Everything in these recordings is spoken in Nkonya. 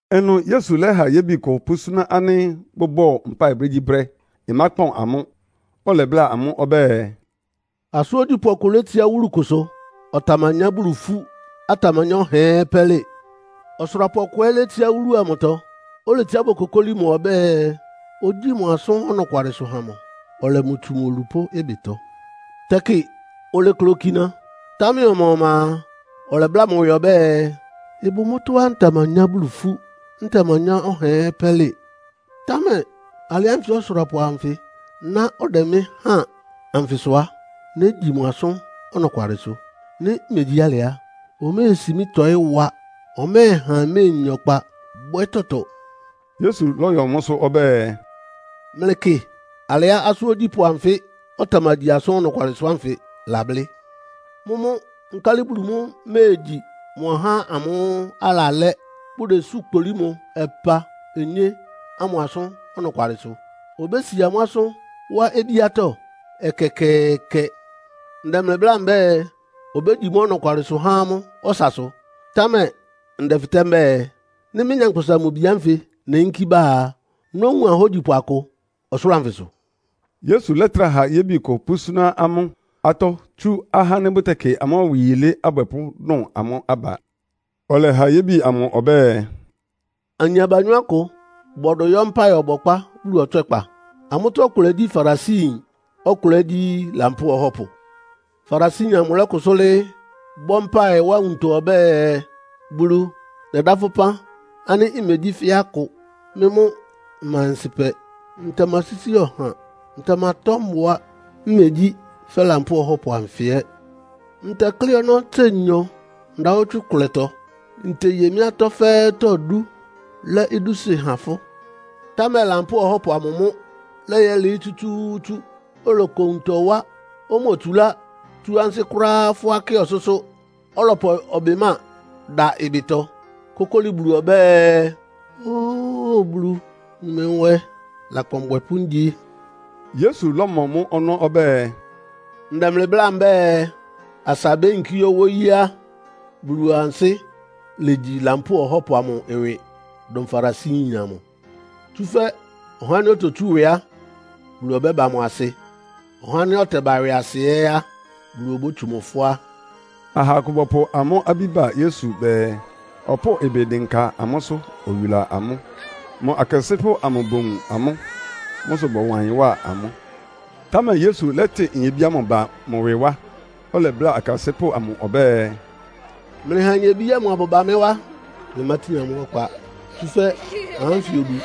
Ɩnʋ Yesu lɛ́ha yébi kʋ pʋ́súná ánɩ́ bʋbɔ́ɔ mpáɩ brégyíbrɛ́, ɩmákpɔn amʋ́. Ɔlɛbláa amʋ́ ɔbɛ́ɛ, “Asʋ́n ogyípʋ́ ɔkʋ létsiá wúlu kʋsʋ. Ɔtamanyá Bulu ifú, ɔtamanyá ɔhaa ɛ́ pɛ́lɩ. Ɔsʋrapʋ ɔkʋ ɛ́ létsiá wúlu amʋtɔ. Oletsiá bokokóli mʋ ɔbɛ́ɛ, ogyíi mʋ asʋ́n ɔnɔkwalɩsʋ ha mʋ, ɔlɛ mʋ tsu mʋ olupʋ́ ɩbɩtɔ! Tɛkɩ olekle okina, támɛ ɔma-ɔma a, ɔlɛbláa mʋ ɩwɩ ɔbɛ́ɛ, ‘Ɩbʋ mʋ́tɔ́á ntamanyá Bulu ifú, ntamanyá ɔhaa ɛ́ pɛ́lɩ. Támɛ alɩ ánfɩ ɔsʋrapʋ anfɩ ná ɔdɛ mɩ́ háan anfɩ sʋ á, négyi mʋ asʋ́n ɔnɔkwalɩsʋ. Nɩ́ megyí alɩ á, oméesi mɩ́ tɔ́ɩ wa. Ɔmɛ́ɛha mméenya ɔkpa bwɛ́ tɔtɔ.’” Yesu lɔ́yɔ mʋ́sʋ́ ɔbɛ́ɛ, “Mlɩkɩ alɩá asʋ́n ogyípʋ́ anfɩ́ ɔtamagyi asʋ́n ɔnɔkwalɩsʋ ánfɩ lablɩ́. Mʋ́mʋ́ nkálɩ Bulu mʋ́ méegyi mʋ ahá ámʋ́ʋ́ alalɛ́, bʋdesú kpolí mʋ ɔpa-onyé ámʋ asʋ́n ɔnɔkwalɩsʋ? Obési amʋ́ asʋ́n wá obíátɔ́? Ɛkɛkɛɛkɛ! Ndɛ mlɩ bláa mbɛ́ɛ, obégyi mʋ́ ɔnɔkwalɩsʋ há amʋ́ ɔsasʋ. Támɛ ndɛfɩtɛ́ mbɛ́ɛ, nɩ́ mɩ́, Nyankpʋsa-Mʋ-Bi ánfɩ neyínkí bá a, nówun ahógyipʋ akʋ ɔsʋlʋ́ʋ anfɩsʋ?” Yesu lɛ́trá ha yébi kʋ pʋ́súná amʋ́ atɔ́ tsú ahá ánɩ́ bʋtɛkɩ amʋ́ ɩwɩ yilé abwɛpʋ́ dʋn amʋ́ aba. Ɔlɛha yébi amʋ ɔbɛ́ɛ, “Ayin abanyɔ́ akʋ bɔdʋ yɔ́ mpáɩ ɔbɔkpá Bulu ɔtswɛ́kpa. Amʋ́tɔ́ ɔkʋlɛ gyí Farisiyin, ɔkʋlɛ ɛ́ gyí lampóo ɔhɔ́pʋ. “Farisiyin amʋ lɔ́kʋsʋ́ lɩ́ɩ́, bɔ́ mpáɩ wá nwuntɔ ɔbɛ́ɛ, ‘Bulu, nɛdá fʋ́ ɩpán ánɩ́ mmegyí fɛ́ akʋ. Mɩ́ mʋ́ mma ɔnsɩ́pɛ, ntamasísi ɔha, ntamatɔ́ mbʋa, mmegyí fɛ́ Lampóo ɔhɔ́pʋ anfɩ ɛ́. Ntɛklɩ́ ɔnɔ́ tse nyɔ ndawɔ́tswɩ́ ɩkʋlɛtɔ. Nteye mɩ́ atɔ́ fɛ́ɛ́tɔ́ dú, lɛ́ idúsɩ́ há fʋ́.’ “Támɛ lampóo ɔhɔ́pʋ amʋ mʋ́ lɛ́yɛlɩɩ́ tsútsú, oloko nwuntɔ wá. Omotsulá tsú ansɩ́ kʋ́ráá fʋ́á kɩ ɔsʋ́sʋ́. Ɔlɔpʋ ɔbɩmáa dá ɩbɩtɔ, kókóli Bulu ɔbɛ́ɛ, ‘Óo Bulu, wun mɩ nwɛ, lakpan ɔbwɛpʋ́ ngyi.’” Yesu lɔ́mɔ mʋ́ ɔnɔ́ ɔbɛ́ɛ, “Ndɛ mlɩ bláa mbɛ́ɛ, asa beyinkí yɔ́ wóyí á, Bulu ansɩ́ légyi lampóo ɔhɔ́pʋ amʋ ɩwɩ dʋn Farisiyin amʋ. Tsúfɛ́ ɔhá ánɩ́ ototsú ɩwɩ á, Bulu ɔbɛ́ba mʋ asɩ. Ɔhá ánɩ́ ɔtɛba ɩwɩasɩ ɛ́ á, Bulu obótsu mʋ fʋ́á.” Aha akʋ bɔpʋ amʋ́ abí ba Yesu bɛɛ, ɔpʋ́ʋ ɩbɩ dɩnka amʋ́sʋ́, oyula amʋ́. Mʋ akasɩ́pʋ́ bowun amʋ́. Mʋ́ sʋ bɔwa ɩyɩn wá amʋ́. Támɛ Yesu lɛ́tɩ nyebí ámʋ ba mʋ ɩwɩ wá, ɔlɛbláa akasɩ́pʋ́ amʋ ɔbɛ́ɛ, “Mlɩha nyebí ámʋ abʋba mɩ́ wá. Mlɩmátin amʋ́ ɔkpa, tsúfɛ́ ahá ánfɩ odu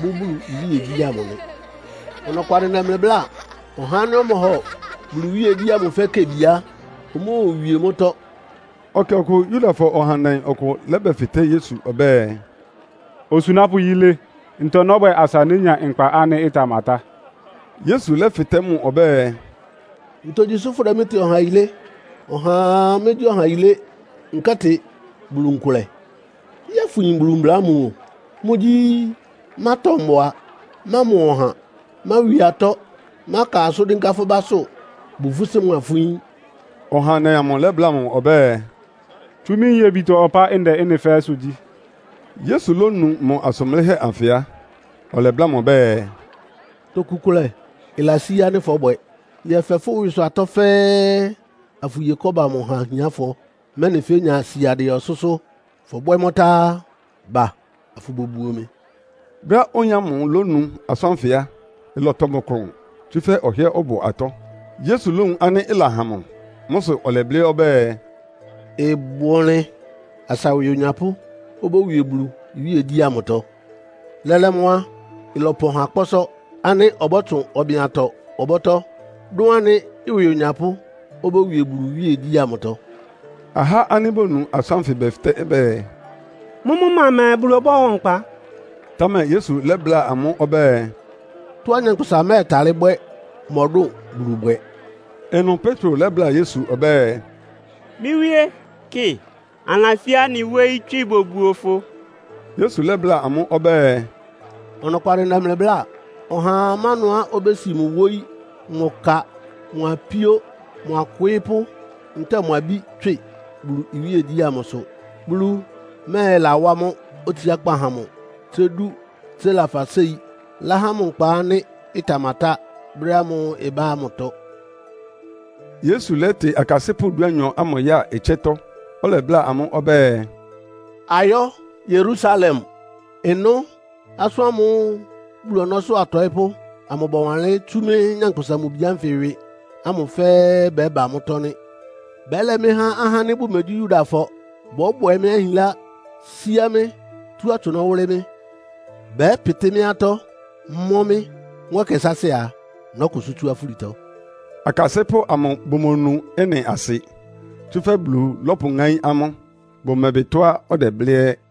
bʋ́ Bulu iwíegyí amʋ nɩ. Ɔnɔkwalɩ ndɛ mlɩ bláa. Ɔhá ánɩ́ ɔmɔhɔ Bulu iwíegyí ámʋ fɛ́ kebi á, omóowie mʋ́tɔ́.” Ɛkɛ ɔkʋ Yudafɔ ɔhandɛ ɔkʋ lɛ́bɛfɩtɛ́ Yesu ɔbɛ́ɛ, “Osunápʋ́ yilé, ntɔ nɔ́bwɛ asa nénya nkpa ánɩ́ ɩtamatá?” Yesu lɛ́fɩtɛ́ mʋ ɔbɛ́ɛ, “Ntogyi sʋ́ fʋdɛ mɩ́ tɩ ɔha yilé? Ɔhaa mégyí ɔha yilé, nkɛ́tɩ Bulu nkʋlɛ. Yɛ́ɛ fʋyin Bulu mbla ámʋ o. Mʋ́gyí, mátɔ mbʋa, mámɔ ɔha, máwi atɔ́, máka asʋ́n dɩ́nká fʋ́ básʋ́, bu fʋ́ sí mʋa fʋ́ yín.” Ɔhandɛ amʋ lɛ́bláa mʋ ɔbɛ́ɛ, “Tsú mɩ́ nyebitɔ ɔpá ndɛ mʋ́ fɛ́ɛ́sʋ́ gyí.” Yesu lónu mʋ asʋn blɩ́hɛ́ anfɩ á, ɔlɛbláa mʋ ɔbɛ́ɛ, “Toku kʋlɛ ɩlasí ánɩ́ fɔ́bwɛ. Yɛfɛ fʋ́ ɩwɩsʋ atɔ́ fɛ́ɛ́, afʋye kɔ́ba amʋ ha ahiánfɔ, mɛ́nɩ fénya siadɩɛ ɔsʋ́sʋ́. Fɔbwɛ́ mʋ́ tá á, ba afʋbobuo mɩ.” Brɛ́á oyin ámʋ lónu asʋ́n ánfɩ á, ɩlɔtɔ mʋ klʋn, tsúfɛ́ ɔhɩ́ɛ́ ɔbʋ atɔ́. Yesu lówun ánɩ́ ɩlahan mʋ. Mʋ́ sʋ ɔlɛblɩ́ ɔbɛ́ɛ, “Ɩbʋ ɔnlɩn asa ɩwɩ onyapʋ́ obówie Bulu iwíegyí ámʋtɔ. Lɛ́lɛ́ mʋ́ á, ɩlɔpɔn ha kpɔ́sɔ́ ánɩ́ ɔbɔ́tsʋn ɔbɩn-atɔ ɔbɔ́tɔ́, dʋn ánɩ́ ɩwɩ onyapʋ́ obówie Bulu iwíegyí ámʋtɔ.” Ahá ánɩ́ bonu asʋ́n ánfɩ bɛfɩtɛ́ bɛɛ, “Mʋ́mʋ́ ma mɛɛ Bulu ɔbɔ́hɔ nkpa?” Támɛ Yesu lɛ́bláa amʋ́ ɔbɛ́ɛ, “Tɔ́á nyankpʋsa mɛ́ɛtalɩ́ bwɛ́ mɔdʋ́n Bulu bwɛ.” Ɩnʋ Petro lɛ́bláa Yesu ɔbɛ́ɛ, “Mɩ́ Wíe, kɩ, anɩlasí anɩ wóyí tswɩ bobuo fʋ.” Yesu lɛ́bláa amʋ́ ɔbɛ́ɛ, “Ɔnɔkwalɩ ndɛ mlɩ bláa. Ɔhaa má ɩnʋá obési mʋ wóyí, mʋ ka, mʋ apíó, mʋ akwɩɩ́pʋ́ ntɛ́ɛ mʋ abí tswɩ Bulu iwíegyí ámʋ sʋ, Bulu mɛ́ɛlawá mʋ́ otsiákpá há mʋ tsé dú tsé lafa séi, láha mʋ nkpa ánɩ́ ɩtamatá brɛ́ ámʋ́ʋ́ ɩbá ámʋtɔ.” Yesu lɛ́tɩ akasɩ́pʋ́ dúanyɔ ámʋ ya ɩtsɛ́tɔ́, ɔlɛbláa amʋ́ ɔbɛ́ɛ, “Ayɔ́ Yerusalem. Ɩnʋ́ asʋ́n ámʋ́ʋ́ Bulu ɔnɔ́sʋ́ atɔɩ́pʋ́ amʋ bɔwanlɩ́n tsú mɩ́, Nyankpʋsa-Mʋ-Bi ánfɩ ɩwɩ ámʋ fɛ́ɛ́ bɛ́ba mʋ́tɔ́ nɩ́. Bɛ́lɛ mɩ́ há ahá ánɩ́ bʋmegyí Yudafɔ. Bɔ́bwɛ mɩ́ ahinlá, síá mɩ́, tú atsʋnɔ́ wʋ́lɩ́ mɩ́. Bɛ́pɩtɩ́ mɩ́ atɔ́, mɔ́ mɩ́. Mʋ́ ɛkɛ sáásɩ́ a, nɔ́kʋsʋ́ tsú afúlitɔ.” Akasɩ́pʋ́ amʋ bʋmonu ɩ́nɩ asɩ, tsúfɛ́ Bulu lɔ́pʋŋáín amʋ́. Bʋmɛbɩ tɔ́á ɔdɛblɩ́ ɛ́.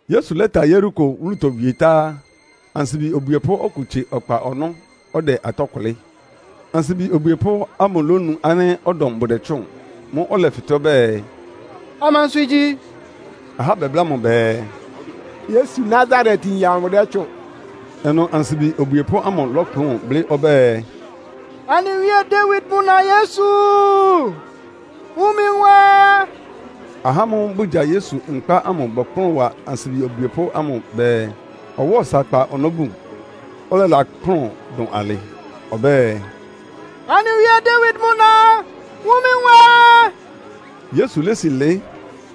Yesu lɛ́ta Yeriko wúlutɔ wie tá á, ansibi obwiepʋ́ ɔkʋ tsie ɔkpa ɔnɔ́, ɔdɛ atɔ́ kʋlɩ́. Ansibi obwiepʋ́ ámʋ lónu ánɩ́ ɔdɔm bʋdɛtsʋ́ʋn. Mʋ́ʋ́ ɔlɛfɩtɛ́ ɔbɛ́ɛ, “Amansʋ igyi?” Ahá bɛbláa mʋ bɛɛ, “Yesu Nasaretyin amʋ dɛ́tsʋ́ʋn.” Ɩnʋ ansibi obwiepʋ́ ámʋ lɔ́kplʋn blɩ́ ɔbɛ́ɛ, “Anɩ wíe Dawid mʋ na Yesu, wun mɩ nwɛ!” Ahá ámʋ́ʋ́ bʋgya Yesu nkpá ámʋ bɔkplʋ́n wa ansibi obwiepʋ́ ámʋ bɛɛ, ɔwáa ɔsa kpa ɔnɔ́ bun. Ɔlɛlakplʋ́n dʋn alɩ ɔbɛ́ɛ, “Anɩ wíe Dawid mʋ na, wun mɩ nwɛ!” Yesu lési lɩɩ́,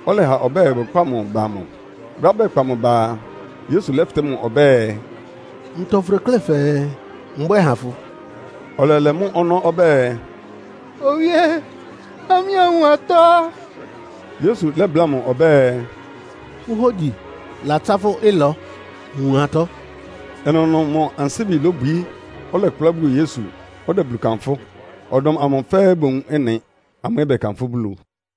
ɔlɛha ɔbɛ́ɛ bʋkpá mʋ ba mʋ. Brɛ́á bɛkpa mʋ ba a, Yesu lɛ́fɩtɛ́ mʋ ɔbɛ́ɛ, “Ntɔ fʋdeklé fɛɛ mbwɛ́ɛ ha fʋ?” Ɔlɛlɛ mʋ́ ɔnɔ́ ɔbɛ́ɛ, “Owíe, ha mɩ́ anwun atɔ́!” Yesu lɛ́bláa mʋ ɔbɛ́ɛ, “Fʋ́ hógyi latsá fʋ́ ɩlɔ. Wun atɔ́.” Ɩnʋnʋ mʋ ansíbi lobwií, ɔlɛkplá buo Yesu, ɔdɛ Bulu kanfʋ́. Ɔdɔm amʋ fɛ́ɛ́ bowun ɩ́nɩ, amʋ́ ɛ́ bɛkanfʋ́ Bulu.